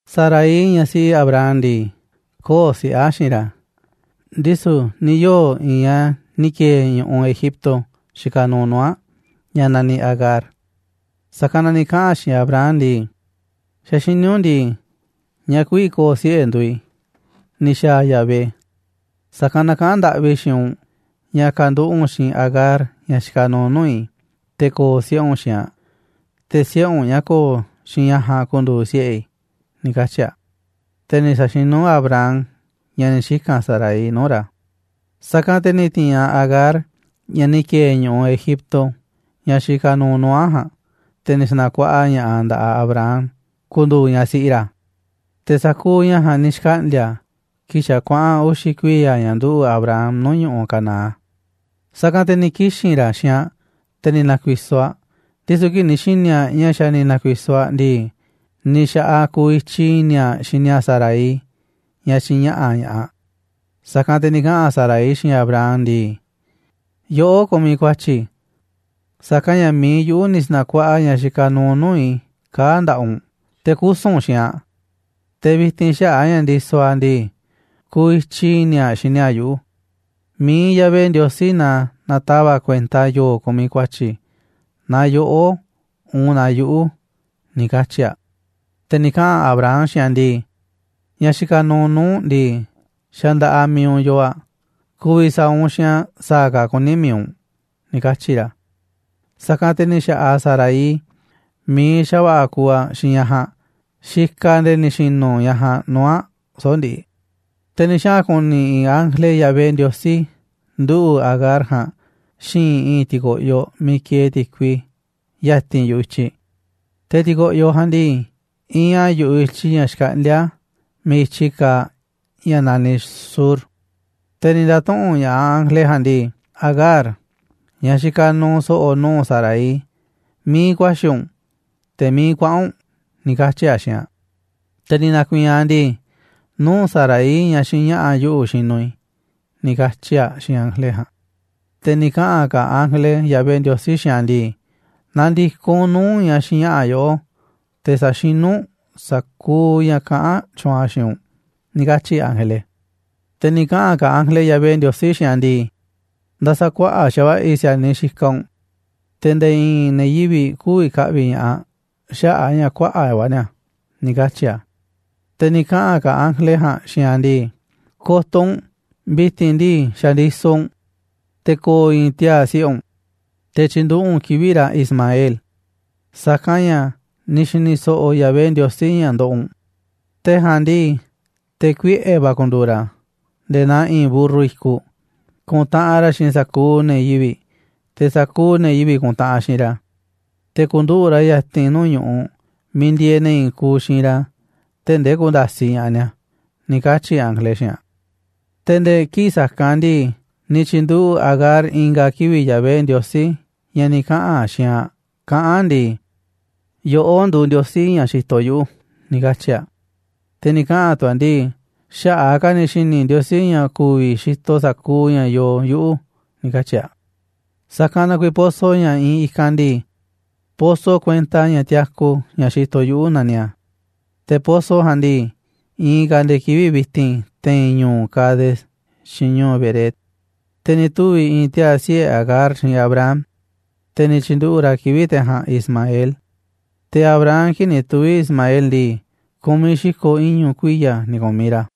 Sarai, ñaꞌ siꞌi Abram ndii, köo̱ꞌ siꞌe̱ aꞌ xiinꞌ ra̱, ndisu̱ ni̱ yoo̱ i̱i̱n ñaꞌ ni̱ ki̱e̱e̱ ñu̱ꞌuꞌ Egipto xikaꞌ nuuꞌ nuu̱ꞌ aꞌ, ñaꞌ naniꞌ Agar. Sa̱kanꞌ na ni̱ kaꞌa̱n aꞌ xiinꞌ Abram ndii: ―Xa̱ xiní u̱nꞌ ndii, ñaꞌ kü̱vi̱ ko̱o̱ siꞌe̱ nduuꞌ i̱ ni̱ xa̱a̱ Yahvé, sa̱kanꞌ na kaꞌán ndaꞌvi i̱ xiinꞌ u̱nꞌ ña̱ ka̱nduꞌu̱ꞌ u̱nꞌ xiinꞌ Agar, ñaꞌ xikaꞌ nuuꞌ nuu̱ꞌ i̱, te̱ ko̱o̱ siꞌe̱ u̱nꞌ xiinꞌ aꞌ, te̱ siꞌe̱ u̱nꞌ ñaꞌ ko̱o̱ xiinꞌ ñaꞌ ja̱a̱nꞌ ku̱ndu̱u̱ siꞌe̱ i̱ ―ni̱ katyi̱ a̱. Te̱ ni̱ sa̱xinú Abram ña̱ ni̱ xika̱n Sarai nuu̱ꞌ ra̱. Sa̱kanꞌ te̱ ni̱ ti̱i̱n aꞌ Agar, ñaꞌ ni̱ ki̱e̱e̱ ñu̱ꞌuꞌ Egipto, ñaꞌ xikaꞌ nuuꞌ nuu̱ꞌ aꞌ ja̱a̱nꞌ, te̱ ni̱ sa̱na̱kuaꞌa ña̱ꞌaꞌ aꞌ nda̱ꞌaꞌ Abram ku̱ndu̱u̱ ñaꞌ siꞌi ra̱. Te̱ sa̱kuuꞌ ña̱ ja̱a̱nꞌ ni̱ xkaꞌndi̱a̱ kii̱ꞌ xa̱ kuaꞌa̱n uxi̱ kuiya̱ ña̱ nduꞌu̱ꞌ Abram nuu̱ꞌ ñu̱ꞌuꞌ Canaán. Sa̱kanꞌ te̱ ni̱ kixi̱n ra̱ xiinꞌ aꞌ, te̱ ni̱ na̱ku̱i̱so̱ aꞌ, ndisu̱ kii̱ꞌ ni̱ xi̱ni̱ aꞌ ña̱ xa̱ ni̱ na̱ku̱i̱so̱ aꞌ ndii, ni̱ xa̱ꞌaꞌ aꞌ kuuꞌ ityi̱ i̱ni̱ aꞌ xini aꞌ Sarai, ñaꞌ xiinꞌ ña̱ꞌa̱ ña̱ꞌaꞌ. Sa̱kanꞌ te̱ ni̱ kaꞌa̱n Sarai xiinꞌ Abram ndii: ―Yoꞌó kumiꞌ ku̱a̱tyi̱, sa̱kanꞌ ña̱ mi̱iꞌ i̱ yuꞌu̱ ni̱ sa̱na̱kuaꞌa ñaꞌ xikaꞌ nuuꞌ nuu̱ꞌ i̱ kaa̱ꞌ nda̱ꞌaꞌ u̱nꞌ, te̱ kusu̱n u̱nꞌ xiinꞌ aꞌ, te̱ vi̱ti̱n xaꞌa̱ꞌ a̱ ña̱ ndisoꞌ aꞌ ndii, kuuꞌ ityi̱ i̱ni̱ aꞌ xini aꞌ yuꞌu̱. Mi̱iꞌ Yahvé Ndiosí na na̱tava̱ꞌ kuenta yo̱o̱ kumiꞌ ku̱a̱tyi̱, naaꞌ yoꞌó, uun naaꞌ yuꞌu̱ ―ni̱ katyi̱ aꞌ. Te̱ ni̱ kaꞌa̱n Abram xiinꞌ aꞌ ndii: ―Ñaꞌ xikaꞌ nuuꞌ nuu̱ꞌ u̱nꞌ ndii, xa̱ nda̱ꞌaꞌ mi̱iꞌ u̱nꞌ yoo aꞌ, ku̱vi̱ sa̱a̱ u̱nꞌ xiinꞌ aꞌ sa̱a̱ ka̱ kuní mi̱iꞌ u̱nꞌ ―ni̱ katyi̱ ra̱. Sa̱kanꞌ te̱ ni̱ xa̱ꞌaꞌ Sarai mi̱iꞌ xa̱va̱ꞌa̱ kuuꞌ aꞌ xiinꞌ ñaꞌ ja̱a̱nꞌ, xikaꞌ aꞌ nde̱e̱ ni̱ xi̱nu̱ ñaꞌ ja̱a̱nꞌ nuu̱ꞌ aꞌ soꞌo̱ꞌ ndiꞌiꞌ. Te̱ ni̱ xaꞌa̱n ku̱ni̱ i̱i̱n ángele Yahvé Ndiosí nduꞌu̱ꞌ Agar ja̱a̱nꞌ xi̱i̱nꞌ i̱i̱n ti̱ko̱ꞌyoꞌ miiꞌ kieeꞌ ti̱kui, ya̱ti̱n yu̱ꞌuꞌ i̱tyiꞌ. Te̱ ti̱ko̱ꞌyoꞌ ja̱a̱nꞌ ndii, iinꞌ a̱ yu̱ꞌuꞌ i̱tyiꞌ ña̱ xkaꞌndíá a̱ miiꞌ i̱tyi kaaꞌ ña̱ naniꞌ Shur. Te̱ ni̱ nda̱tuꞌu̱nꞌ ña̱ꞌaꞌ ángele ja̱a̱nꞌ ndii: ―Agar, ñaꞌ xikaꞌ nuuꞌ so̱ꞌo̱ nuu̱ꞌ Sarai, ¿miiꞌ ku̱a̱xi̱ u̱nꞌ, te̱ miiꞌ kuaꞌa̱n u̱nꞌ? ―ni̱ katyi̱ a̱ xiinꞌ aꞌ. Te̱ ni̱ na̱ku̱i̱i̱n aꞌ ndii: ―Nuu̱ꞌ Sarai, ñaꞌ xiinꞌ ña̱ꞌa̱ yuꞌu̱, xinuꞌ i̱ ―ni̱ katyi̱ aꞌ xiinꞌ ángele ja̱a̱nꞌ. Te̱ ni̱ kaꞌa̱n ka̱ ángele Yahvé Ndiosí xiinꞌ aꞌ ndii: ―Na̱ndi̱koꞌ u̱nꞌ nuu̱ꞌ ñaꞌ xiinꞌ ña̱ꞌa̱ yoꞌó, te̱ sa̱xinú u̱nꞌ sa̱kuuꞌ ña̱ kaꞌán tyuunꞌ aꞌ xiinꞌ u̱nꞌ ―ni̱ katyi̱ ángele. Te̱ ni̱ kaꞌa̱n ka̱ ángele Yahvé Ndiosí xiinꞌ aꞌ ndii: ―Nda̱sa̱kuaꞌa̱ꞌ xa̱va̱ꞌa̱ i̱ si̱a̱niꞌ xikaꞌ u̱nꞌ te̱ nde̱e̱ i̱i̱n ne̱ yivi̱ꞌ kü̱vi̱ ka̱ꞌvi̱ ña̱ꞌaꞌ xaꞌa̱ꞌ a̱ ña̱ kuaꞌa̱ꞌ va̱ ni̱a̱ ―ni̱ katyi̱ a̱. Te̱ ni̱ kaꞌa̱n ka̱ ángele ja̱a̱nꞌ xiinꞌ aꞌ ndii: ―Ko̱to̱ u̱nꞌ, vi̱ti̱n ndii xa̱ ndisoꞌ u̱nꞌ, te̱ ko̱o̱ i̱i̱n tiaa̱ siꞌe̱ u̱nꞌ, te̱ tyi̱nduꞌu̱ꞌ u̱nꞌ kivi̱ꞌ ra̱ Ismael, sa̱kanꞌ ña̱ ni̱ xi̱ni̱ so̱ꞌo̱ Yahvé Ndiosí ña̱ ndoꞌoꞌ u̱nꞌ. Te̱ ja̱a̱nꞌ ndii, te̱ kuiꞌe̱ va̱ ku̱ndu̱u̱ ra̱ nde̱e̱ naa i̱i̱n mburru i̱kuꞌ, ku̱ntaꞌanꞌ ra̱ xiinꞌ sa̱kuuꞌ ne̱ yivi̱ꞌ, te̱ sa̱kuuꞌ ne̱ yivi̱ꞌ ku̱ntaꞌanꞌ xiinꞌ ra̱. Te̱ ku̱nduꞌu̱ꞌ ra̱ ya̱ti̱n nuu̱ꞌ ñu̱ꞌuꞌ miiꞌ ndieeꞌ ne̱ i̱i̱n kuuꞌ xiinꞌ ra̱, tee̱ꞌ ndee ku̱nda̱siꞌ ña̱ꞌaꞌ ni̱a̱ ―ni̱ katyi̱ ángele xiinꞌ aꞌ. Te̱ nde̱e̱ kii̱ꞌ sa̱kanꞌ ndii, ni̱ tyi̱nduꞌu̱ꞌ Agar i̱nga̱ kivi̱ꞌ Yahvé Ndiosí, ña̱ ni̱ kaꞌa̱n xiinꞌ aꞌ kaꞌán aꞌ ndii: «Yoꞌó nduuꞌ Ndiosí ña̱ xitoꞌ yuꞌu̱», ni̱ katyi̱ aꞌ. Te̱ ni̱ kaꞌa̱n tu̱ aꞌ ndii: «Xaꞌa̱ꞌ a̱ ka̱ ni̱ xi̱ni̱ Ndiosí ña̱ ku̱vi̱ xitoꞌ sa̱kuuꞌ ña̱ yoo yuꞌu̱», ni̱ katyi̱ aꞌ. Sa̱kanꞌ na kuiiꞌ pozo ña̱ iinꞌ i̱kanꞌ ndii: «Pozo kuenta ña̱ tiaku, ña̱ xitoꞌ yuꞌu̱», naniꞌ a̱. Te̱ pozo ja̱a̱nꞌ ndii, iinꞌ ka̱ a̱ nde̱e̱ kivi̱ꞌ vi̱ti̱n te̱i̱n ñu̱u̱ Cades xiinꞌ ñu̱u̱ Bered. Te̱ ni̱ tuvi̱ i̱i̱n tiaa̱ siꞌe̱ Agar xiinꞌ Abram, te̱ ni̱ tyi̱nduꞌu̱ꞌ ra̱ kivi̱ꞌ te̱ ja̱a̱nꞌ Ismael. Te̱ Abram, kii̱ꞌ ni̱ tuvi̱ Ismael ndii, ku̱miꞌ xi̱ko̱ iñu̱ kuiya̱ ni̱ ku̱miꞌ ra̱.